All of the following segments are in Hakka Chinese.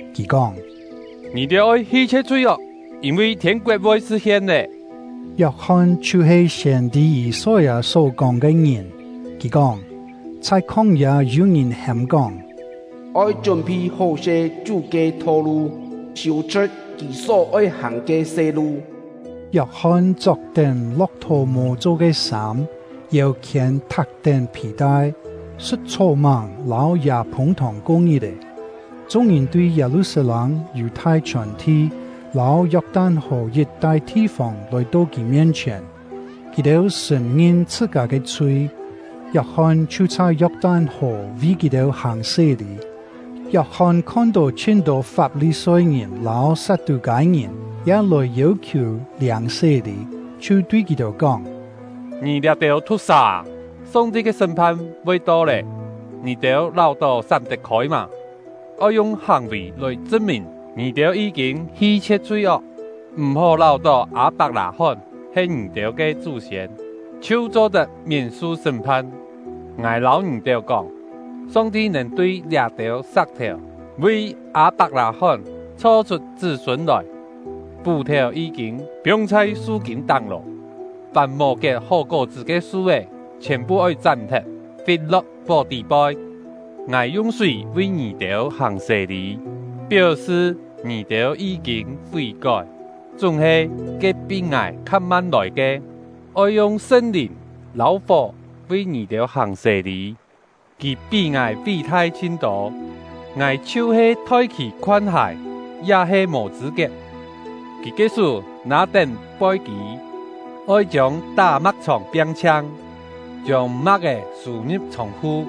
Kì kóng: “Ngì-têu oi hi-chhie̍t chhui-ok, yîn-vi thiên-koet voi sṳ̍t-hien lé!” Yok-hon chhiu-he siên-tî Yî-soi-â só-kóng ke ngìn; kì kóng: Chhai khóng-yâ yû-ngìn hêm-kóng: “Oi chún-phi hó-se Chú ke tho-lu, siû-chhṳ̍t Kì só-oi hàng ke se-lu!” Yok-hon chok-tén lo̍k-thò-mô cho ke sâm, yêu-khiên thak-tén phì-tai; sṳ̍t chhó-máng lâu yâ-phûng-thòng ko ngit-è. Chung-ngìn tui Yâ-lu-sat-lâng, Yù-thai chhiòn-thi, lâu Yok-tan-hò yit-tai thi-fông lòi-to kì mien-chhièn. Kì-têu sṳ̀n-ngin chhṳ-kâ ke chhui; Yok-hon chhiu chhai Yok-tan-hò vi kì-têu hàng sé-lî. Yok-hon khon-tó chhin-tô Fap-li-soi-ngìn lâu Sat-tû-kâi-ngìn ya lòi yêu-khiù liâng sé-lî, chhiu tui kì-têu kóng: “Ngì liá-têu thu̍k-sà â! Song-ti ke sṳ́m-phan voi to lé, ngì-têu láu-tó sám tet-khôi mâ? Oi yung hàng-vì lòi chṳn-mìn ngì-têu yí-kîn hi-chhie̍t chhui-ok. M̀-hó láu-tó Â-pak-lâ-hón he ngì-têu ke chú-siên chhiu cho-tet miên-su sṳ́m-phan. Ngài lâu ngì-têu kóng, Song-ti nèn tui liá-têu sa̍k-thèu vi Â-pak-lâ-hón chho-chhut chṳ́-sûn lòi! Pú-thèu yí-kîn piong chhai su-kîn táng lô, fàm mò kiet hó kó-chṳ́ ke su-é chhiòn-phu oi chám-thet, fit-lo̍k fó tî-poi. Ngài yung súi vi ngì-têu hàng sé-lî, péu-sṳ ngì-têu yí-kîn fí-kói; chúng-he, ke pí ngài kha-man lòi ke, oi yung Sṳn-Lìn lâu fó vi ngì-têu hàng sé-lî. Kì pí ngài ví-thai chhin-tô, ngài chhiu-he thoi kì khoan hài ya he mò chṳ̂-kiet. Kì ke sú nâ-tén poi-kî, oi chiông tá-ma̍k-chhòng piang-chhiang, chiông ma̍k-é sû-ngi̍p chhông-khu,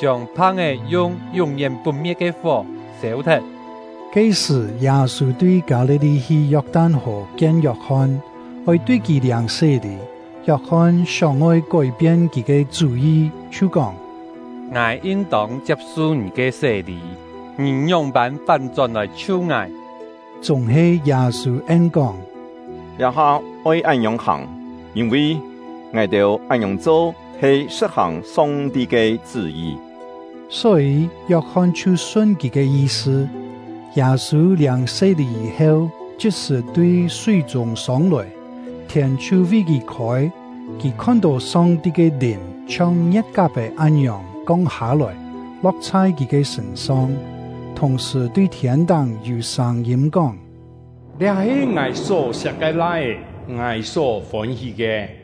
chiông phang-é yung yún-yén put-me̍t ke fó sêu-thet!” Ke-sṳ̀, Yâ-sû tui Kâ-li-li hi Yok-tan-hò kien Yok-hon, oi tui kì liâng sé-lî. Yok-hon sióng-oi kói-pien kì ke chú-yi, chhiu kóng: “Ngài yin-tông chiap-su ngì ke sé-lî, ngì ngióng-pân fán-chón lòi-chhiu ngài!” Chúng-he Yâ-sû en-kóng: “Liá-ha oi án-ngiòng hàng, yîn-vi ngài-têu án-ngiòng cho he sṳ̍t-hàng Song-ti ke chṳ́-yi.” Só-yî, Yok-hon chhiu sun kì ke yi-sṳ. Yâ-sû liâng sé-lî yî-heu, chit-sṳ̀ tui súi-chûng sông-lòi, thiên chhiu vi kì khôi; kì khon-tó Song-ti ke Lìn chhiong ngie̍t-kap-è án-ngiòng kong hâ-lòi, lo̍k chhai kì ke sṳ̂n-song. Thùng-sṳ̀, tui thiên-táng yû sâng-yîm kóng: “Liá he Ngài só-siak ke Lai-é, Ngài só fôn-hí ke.”